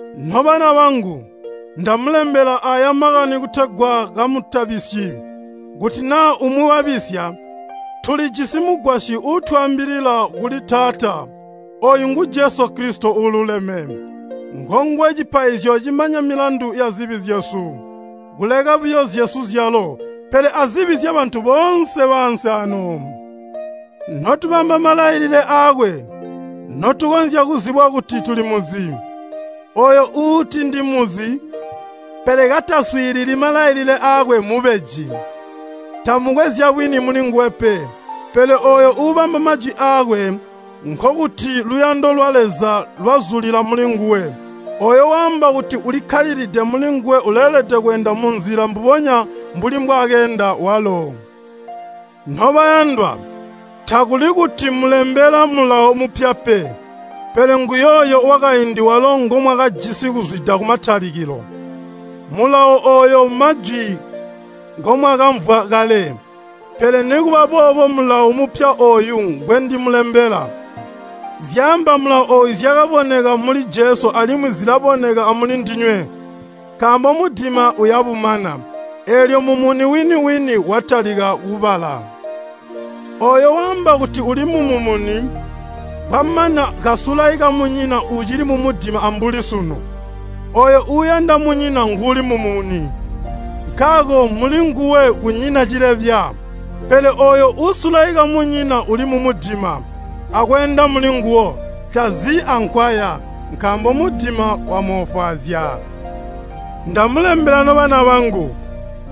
Nobana bangu, ndamulembela aaya makani kutegwa kamutabisyi. Kuti naa umwi wabisya, tulijisi Mugwasyi uutwaambilila kuli Taata, ooyu ngu Jesu Kilisito uululeme. Ngonguwe cipaizyo cimanya milandu yazibi zyesu, kuleka buyo zyesu zyalo, pele azibi zyabantu boonse baansi aano. Notubamba malailile aakwe, notukonzya kuzibwa kuti tulimuzi. Ooyo uuti ndimuzi, pele kataswiilili malailile aakwe mmubeji, tamukwe zyabwini mulinguwe pe. Pele ooyo uubamba majwi aakwe, nkokuti luyando lwa Leza lwazulila mulinguwe. Ooyo waamba kuti ulikkalilide mulinguwe uleelede kweenda munzila mbubonya mbuli mbwaakeenda walo. Nobayandwa, takuli kuti mmulembela mulawo mupya pe, pele nguyooyo wakaindi walo ngomwakajisi kuzwida kumatalikilo. Mulawo ooyo mmajwi ngomwakamvwa kale. Pele nikuba boobo mmulawo mupya ooyu ngwendimulembela. Zyaamba mulawo ooyu zyakaboneka muli Jesu alimwi zilaboneka amuli ndinywe. Nkaambo mudima uyabumana, eelyo mumuni wini-wini watalika kubala. Ooyo waamba kuti uli mumumuni, kwamana kasulaika munyina ucili mumudima ambuli sunu. Ooyo uuyanda munyina nguuli mumumuni, nkaako mulinguwe kunyina cilebya. Pele ooyo uusulaika munyina uli mumudima, akweenda mulinguwo. Tazi ankwaya, nkaambo mudima wamoofwaazya. Ndamulembela nobana bangu,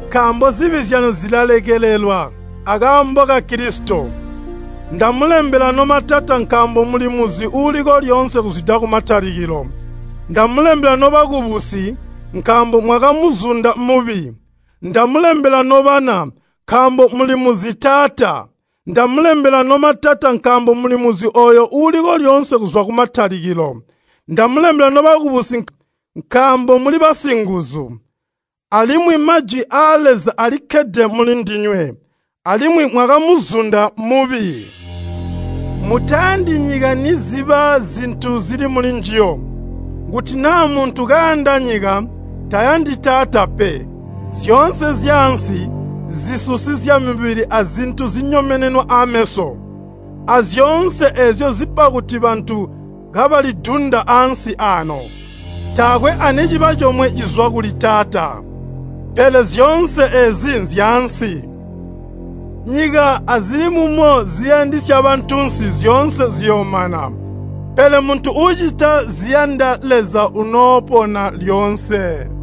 nkaambo zibi zyanu zilalekelelwa akaambo ka Kilisito. Ndamulembela nomatata nkaambo mulimuzi uuliko lyoonse kuzwida kumatalikilo. Ndamulembela nobakubusi, nkaambo mwakamuzunda mubi. Ndamulembela nobana, nkaambo mulimuzi Taata. Ndamulembela nomatata nkaambo mulimuzi ooyo uuliko lyoonse kuzwa kumatalikilo. Ndamulembela nobakubusi nkaambo muli basinguzu, alimwi Majwi aa Leza alikkkede muli ndinywe, alimwi mwakamuzunda mubi. Mutayandi nyika niziba zintu zili mulinjiyo. Kuti naa muntu kayanda nyika, tayandi Taata pe. Zyoonse zyaansi, zisusi zyamubili azintu zinyomenenwa ameso, azyoonse eezyo zipa kuti bantu kabalidunda ansi aano, taakwe aniciba comwe cizwa kuli Taata, pele zyoonse eezi nzyaansi. Nyika azili mumo ziyandisya bantunsi zyoonse ziyoomana, pele muntu uucita ziyanda Leza unoopona lyoonse.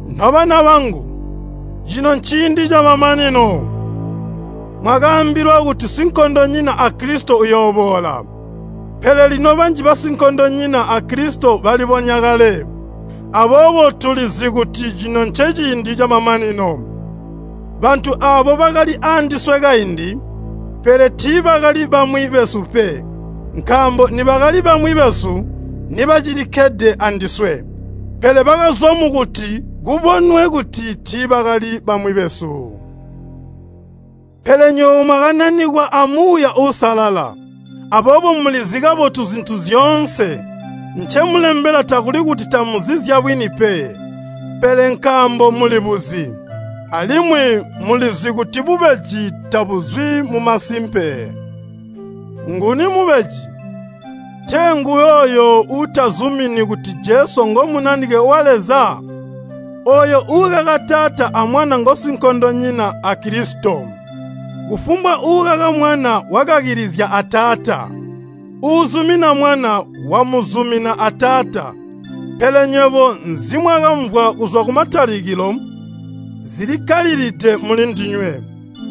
Nobana bangu, cino nciindi camamanino! Mwakaambilwa kuti sinkondonyina a Kilisito uyooboola, pele lino banji basinkondonyina a Kilisito balibonya kale, aboobo tulizi kuti cino nceciindi camamanino. Bantu aabo bakali aandiswe kaindi, pele tiibakali bamwi besu pe. Nkaambo nibakali bamwi besu nibacilikkalilide andiswe. Pele bakazwa mukuti kubonwe kuti tiibakali bamwi besu. Pele nywebo mwakananikwa a Muuya Uusalala, aboobo mulizi kabotu zintu zyoonse. Ncemulembela takuli kuti tamuzi zyabwini pe, pele nkaambo muli buzi, alimwi mulizi kuti bubeji tabuzwi mumasimpe. Nguni mubeji, tee nguyooyo uutazumini kuti Jesu ngo Munanike wa Leza? Ooyo uukaka Taata a Mwana ngosinkondonyina a Kilisito. Kufumbwa uukaka Mwana wakakilizya a Taata. Uuzumina Mwana, wamuzumina a Taata. Pele nywebo nzimwakamvwa kuzwa kumatalikilo, zilikkalilide mulindinywe.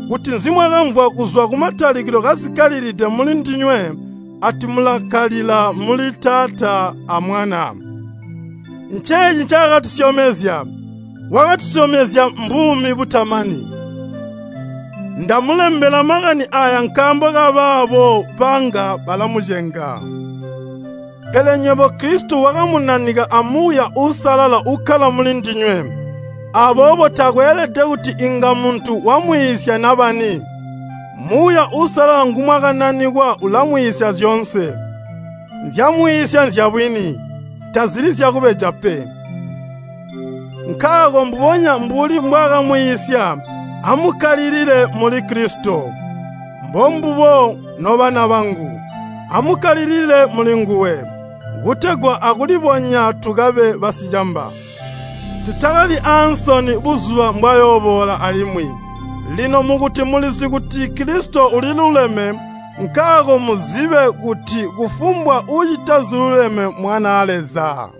Kuti nzimwakamvwa kuzwa kumatalikilo kazikkalilide mulindinywe ati mulakkalilila muli Taata a Mwana. Nceeci ncaakatusyomezya, wakatusyomezya mbuumi butamani. Ndamulembela makani aaya nkaambo kabaabo banga balamucenga. Pele nywebo Kilisito wakamunanika a Muuya Uusalala ukkala muli ndinywe. Aboobo takweelede kuti inga muntu wamwiisya nabani. Muuya Uusalala ngumwakananikwa ulamwiisya zyoonse. Nzyaamwiisya nzyabwini, tazili zyakubeja pe. Nkaako mbubonya mbuli mbwaakamwiisya, amukkalilile muli Kilisito. Mbombubo, nobana bangu, amukkalilile mulinguwe, kutegwa aakulibonya tukabe basicamba. Tutakabi aansoni buzuba mbwayooboola alimwi. Lino mukuti mulizi kuti Kilisito uliluleme, nkaako muzibe kuti kufumbwa uucita ziluleme mmwanaa Leza.